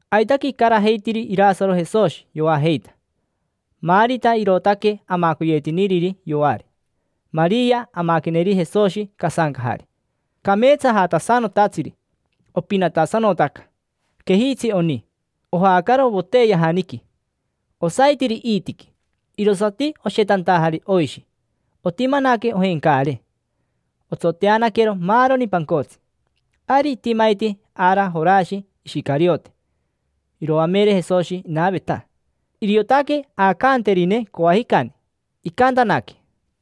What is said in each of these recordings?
Aitaque icarajeitiri Irasaro Jesoshi, yoajeita. Marita irootaque amacoyetiniriri yoari. Maria amaqueneri Jesoshi casancajari, cameetsajatasanotatsiri. Opinatasanotaca. Quejitsi oni, ojaacaro voteyajaniqui. Osaitiri iitiqui, irosati oshetantajari oishi. Otimanaque ojencaare, otsoteanaquero maaroni pancotsi. Ari itimaiti ara Jorashi Ishicariote. Iroamere Jesoshi inaveta, iriotaque aacanterine coajicani. Icantanaque: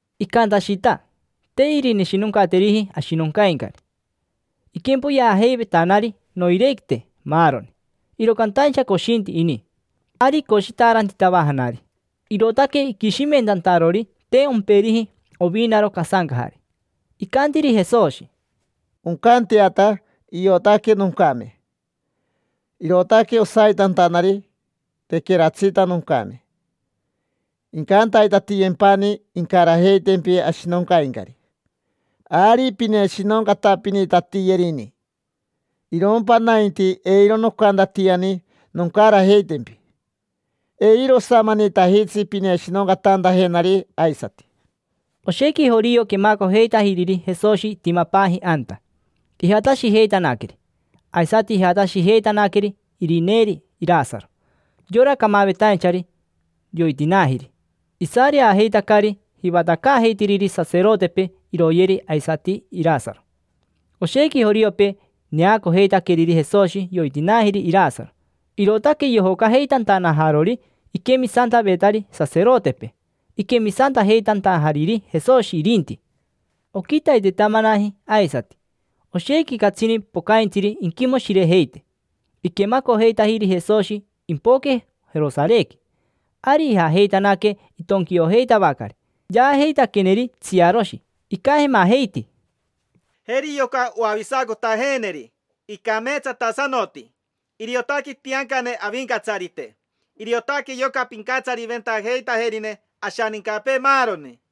Icantashita: te irineshinoncateriji ashinoncaincari. Iquempoyeajeivetanari noirequite maaroni, iro cantaincha coshinti ini. Ari icoshitaarantitavajanari, irootaque iquishimentantarori te omperiji ovinaro casancajari. Icantiri Jesoshi: —Oncanteata. Iotaque noncame, irootaque osaitantanari tequeratsita noncame. Incantaitatiyempani incarajeitempi ashinoncaincari, ari pineshinoncatapinitatiyerini. Irompa nainti eiro nocantatiani noncarajeitempi. Eiro osamanitajitsi pineshinoncatantajenari aisati. Oshequi jorio quemacojeitajiriri Jesoshi itimapaaji anta, ijatashijeitanaqueri. Aisati ijatashijeitanaqueri irineeri Irasaro, yora camavetainchari yoitinaajiri. Isareajeitacari jivatacaajeitiriri saserotepee iroyeri aisati Irasaro. Oshequi joriopee neacojeitaqueriri Jesoshi yoitinaajiri Irasaro, irootaque yojocajeitantanajarori iquemisantavetari saserotepee, iquemisantajeitantajariri Jesoshi irinti. Oquitaitetamanaji aisati. Oshequi catsini pocaintsiri inquimoshirejeite. Iquemacojeitajiri Jesoshi impoque Jerosarequi. Ari ijajeitanaque itonquiojeitavacari. Yaajeitaqueneri tsiaroshi. Icajemajeiti: —Jeri yoca oavisacotajeeneri, icameetsatasanoti. Iriotaque itiancane Avincatsarite. Iriotaque yoca pincatsariventajeitajerine ashanincapee, maaroni.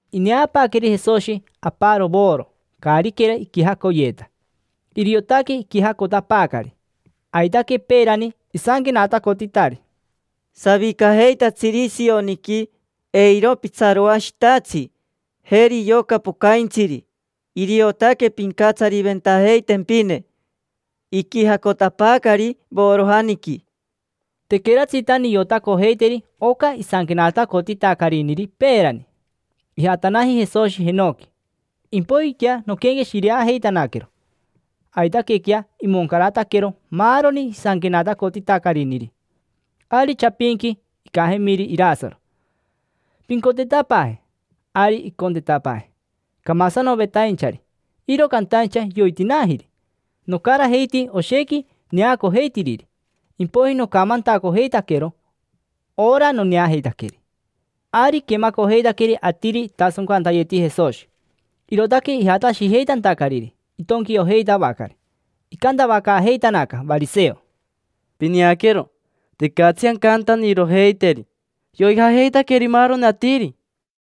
Ineapaaqueri Jesoshi aparo voro caariquera iquijacoyeeta. Iriotaque iquijacotapaacari. Aitaque peerani isanquenatacotitari: “Savicajeitatsiri Sioniqui, eiro pitsaroashitatsi. Jeri yoca pocaintsiri, iriotaque pincatsariventajeitempine; iquijacotapaacari vorojaniqui”. Tequeratsita niotacojeiteri oca isanquenatacotitacariniri peerani: ijatanaji Jesoshi jenoqui, impoijiquea noquenqueshireajeitanaquero. Aitaquequea imoncarataquero maaroni isanquenatacotitacariniri. Ari chapinqui icajemiri Irasaro: “Pincontetapaaje”, ari icontetapaaji. Camasanovetainchari, iro cantaincha yoitinaajiri: nocarajeiti oshequi neacojeitiriri, impoiji nocamantacojeitaquero ora noneajeitaqueri. Ari iquemacojeitaqueri atiri itasoncantayeti Jesoshi, irootaque ijatashijeitantacariri itonquiojeitavacari. Icantavacaajeitanaca variseo: —Pineaquero, tecatsi ancantanirojeiteri. Yoijajeitaqueri maaroni atiri.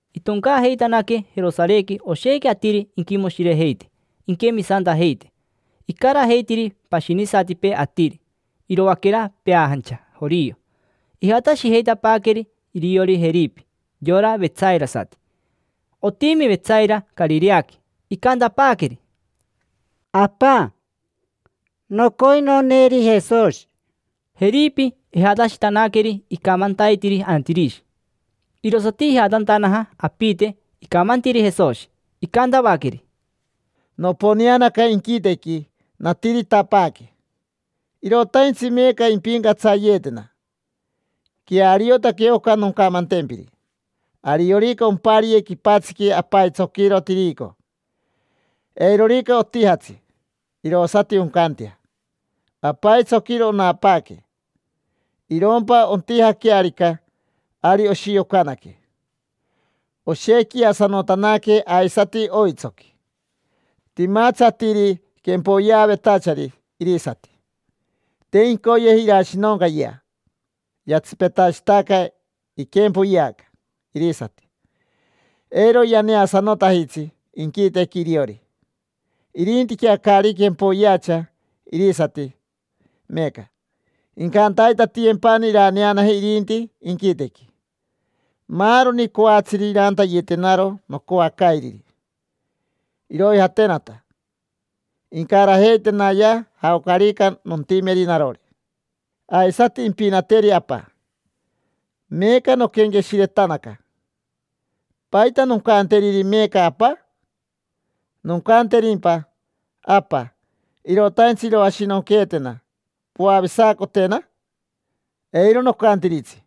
Itoncaajeitanaque Jerosarequi oshequi atiri inquimoshirejeite, inquemisantajeite. Icarajeitiri pashinisatipee atiri, iroaquera peajancha jorio. Ijatashijeitapaaqueri iriori Jeripi, yora vetsairasati. Otimi Vetsaira Carireaqui. Icantapaaqueri: —Apa, nocoi noneeri Jesoshi. Jeripi ijatashitanaqueri icamantaitiri Antirishi. Irosati ijatantanaja apite, icamantiri Jesoshi. Icantavaqueri: —Noponeanaca inquitequi, natiritapaaque; irotaintsi meeca impincatsayeetena. Queariotaque oca noncamantempiri. Ariorica ompariye quipatsiqui apaitsoquiro tirico, eirorica otijatsi, irosati oncantea: apaitsoquiro onapaaque. Irompa ontijaquearica, ari oshiocanaque, oshequiasanotanaque aisati oitsoqui. Timatsi atiri quempoyeavetachari irisati, te incoyeji irashinoncayea, yatsipetashitaca iquempoyeaca irisati; eiro yaneasanotajitsi inquitequi iriori. Irintiquea caari quempoyeacha irisati meeca, incantaitatiyempani iraneanaje irinti inquitequi. Maaroni coatsiri irantayetenaro nocoacairiri, iroijatenata; incarajeitenaya jaocarica nontimeri narori. Aisati impinateri Apa. Meeca noquenqueshiretanaca. ¿Paita noncanteriri meeca Apa? ¿Noncanterimpa: “Apa, irotaintsi iroashinonqueetena, poavisacotena”? Eiro nocantiritsi.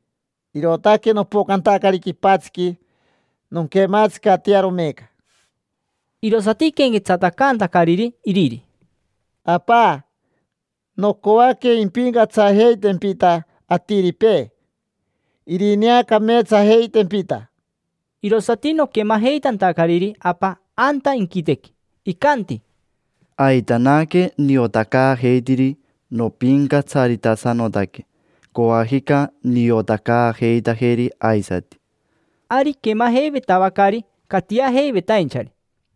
Irootaque nopocantacari quipatsiqui nonquematsicatearo meeca. Irosati iquenquetsatacantacariri iriri: —Apa, nocoaque impincatsajeitempita atiripee, irineacameetsajeitempita. Irosati noquemajeitantacariri Apa anta inquitequi, icanti: —Aitanaque niotacaajeitiri nopincatsaritasanotaque. Coajica niotacaajeitajeri aisati. Ari iquemajeivetavacari catiajeivetainchari,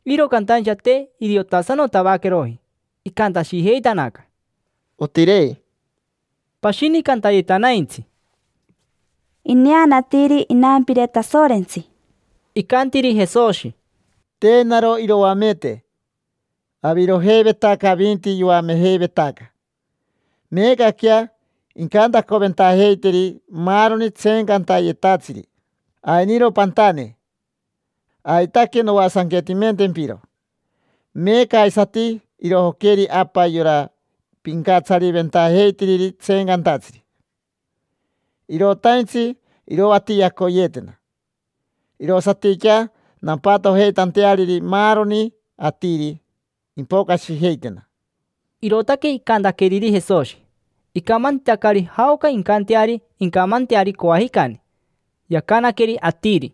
iro cantaincha te iriotasanotavaqueroji. Icantashijeitanaca: —Otirei. Pashini cantayetanaintsi: —Ineanatiri inampire Tasorentsi. Icantiri Jesoshi: —Te naro iroamete: avirojeivetaca avinti yoamejeivetaca. Meecaquea incantacoventajeiteri maaroni tseencantayetatsiri: “Ainiro pantane, aitaque noasanquetimentempiro”. Meeca aisati irojoqueri Apa yora pincatsariventajeitiriri tseencantatsiri. Irotaintsi iroatiacoyeetena, irosatiquea nampatojeitanteariri maaroni atiri, impocashijeitena. Irootaque icantaqueriri Jesoshi. Icamantitacari jaoca incanteari incamanteari coajicani. Yacanaqueri atiri: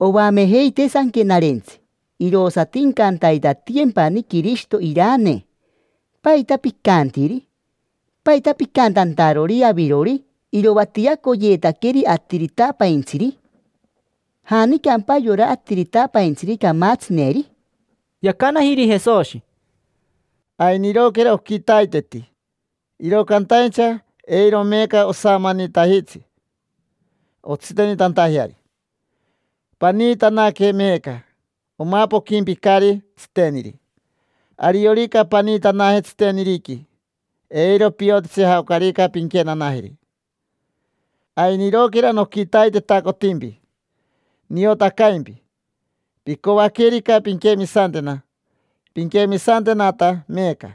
—Oamejeitee Sanquenarentsi: “Irosati incantaitatiyempani Quirishito iranee”. ¿Paita picantiri? ¿Paita picantantarori avirori: “Iroatiacoyeetaqueri Atiritapaintsiri”? ¿Janicampa yora Atiritapaintsiri camatsineri? Yacanajiri Jesoshi: —Ainiroquera oquitaiteti, iro cantaincha eiro meeca osamanitajitsi ontsitenitantajeari. Paniitanaque meeca, omapoquimpicari tsiteniri. Ariorica paniitanaje tsiteniriqui, eiro piotitsi jaocarica pinquenanajeri. Ainiroquera noquitaitetacotimpi, niotacaimpi; picoaquerica pinquemisantena, pinquemisantenata meeca.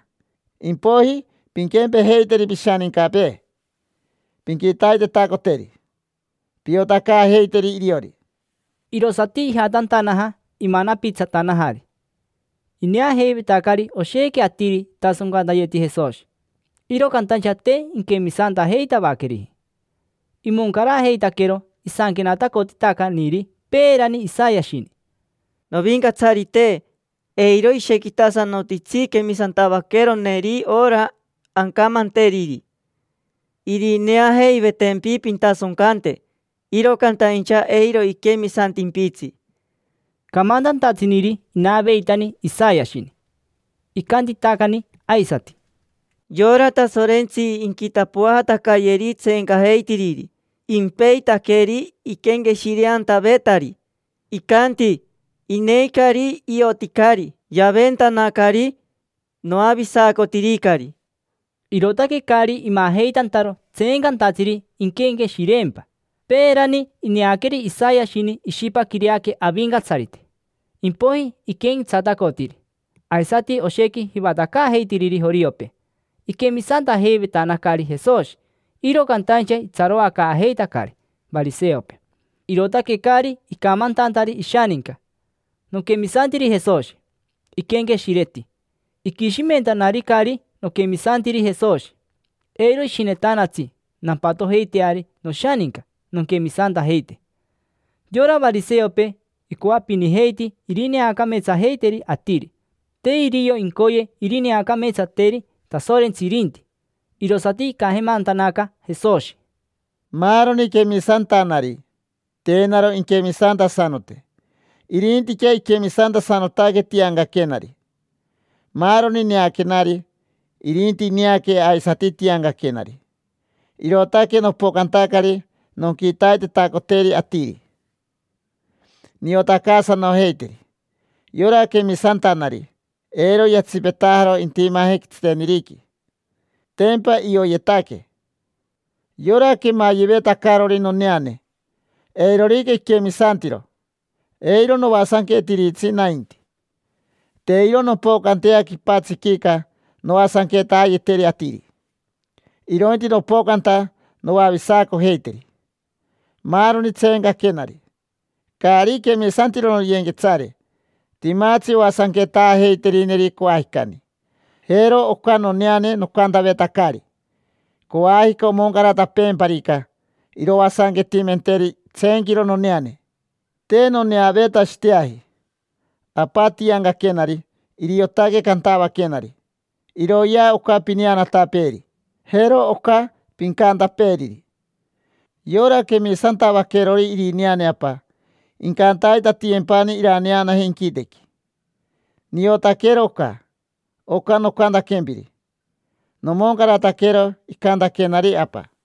Impoiji pinquempejeiteri pishanincapee: pinquitaitetacoteri, piotacaajeiteri iriori. Irosati ijatantanaja, imanapitsatanajari. Ineajeivetacari oshequi atiri itasoncantayeti Jesoshi, iro cantaincha te inquemisantajeitavaqueriji. Imoncarajeitaquero isanquenatacotitacaniri peerani Isayashini: “Novincatsarite, eiro ishequitasanotitsi quemisantavaqueroneri ora ancamanteriri. Irineajeivetempi pintasoncante, iro cantaincha eiro iquemisantimpitsi”. Camantantatsiniri inaveitani Isayashini. Icantitacani aisati: “Yora Tasorentsi inquitapoajatacayeri tseencajeitiriri, impeitaqueri iquenqueshireantavetari. Icanti: ‘Ineicari. Ioticari. Yaventanacari. Noavisacotiricari’”. Irootaque caari imajeitantaro tseencantatsiri inquenqueshireempa. Peerani ineaqueri Isayashini ishipaquireaque Avincatsarite, impoiji iquenquetsatacotiri. Aisati oshequi jivatacaajeitiriri joriopee, iquemisantajeivetanacari Jesoshi. Iro cantaincha itsaroacaajeitacari variseopee, irootaque caari icamantantari ishaninca: “Noquemisantiri Jesoshi”. Iquenqueshireti: “Iquishimentanaricari noquemisantiri Jesoshi, eiro ishinetanatsi nampatojeiteari noshaninca nonquemisantajeite”. Yora variseopee icoapinijeiti irineacameetsajeiteri atiri, te irio incoye irineacameetsateri Tasorentsi irinti. Irosati icajemantanaca Jesoshi: —Maaroni quemisantanari, te naro inquemisantasanote, irintiquea iquemisantasanotaque tiancaquenari. Maaroni neaquenari, irinti ineaque aisati tiancaquenari. Irootaque nopocantacari nonquitaitetacoteri atiri, niotacaasanojeiteri. Yora quemisantanari, eiro yatsipetajaro intimaje tsiteniriqui; tempa ioyetaque. Yora quemayevetacarori noneane: eirorica iquemisantiro, eiro noasanquetiritsi nainti. Te iro nompocantea quipatsiquica noasanquetaayeteri atiri, irointi nopocanta noavisacojeiteri. Maaroni tseencaquenari, caari quemisantiro noyenquetsare, timatsi oasanquetaajeiterineri coajicani. Jero oca noneane nocantavetacari: coajica omoncaratapeemparica, iroasanquetimenteri itseenquiro noneane. Te noneaveetashiteaji. Apa tiancaquenari, iriotaque cantavaquenari: “Iroyea oca pineanatapeeri. Jero oca pincantapeeriri”. Yora quemisantavaquerori irineane Apa, incantaitatiyempani iraneanaje inquitequi. Niotaquero oca. Oca nocantaquempiri, nomoncarataquero icantaquenari Apa.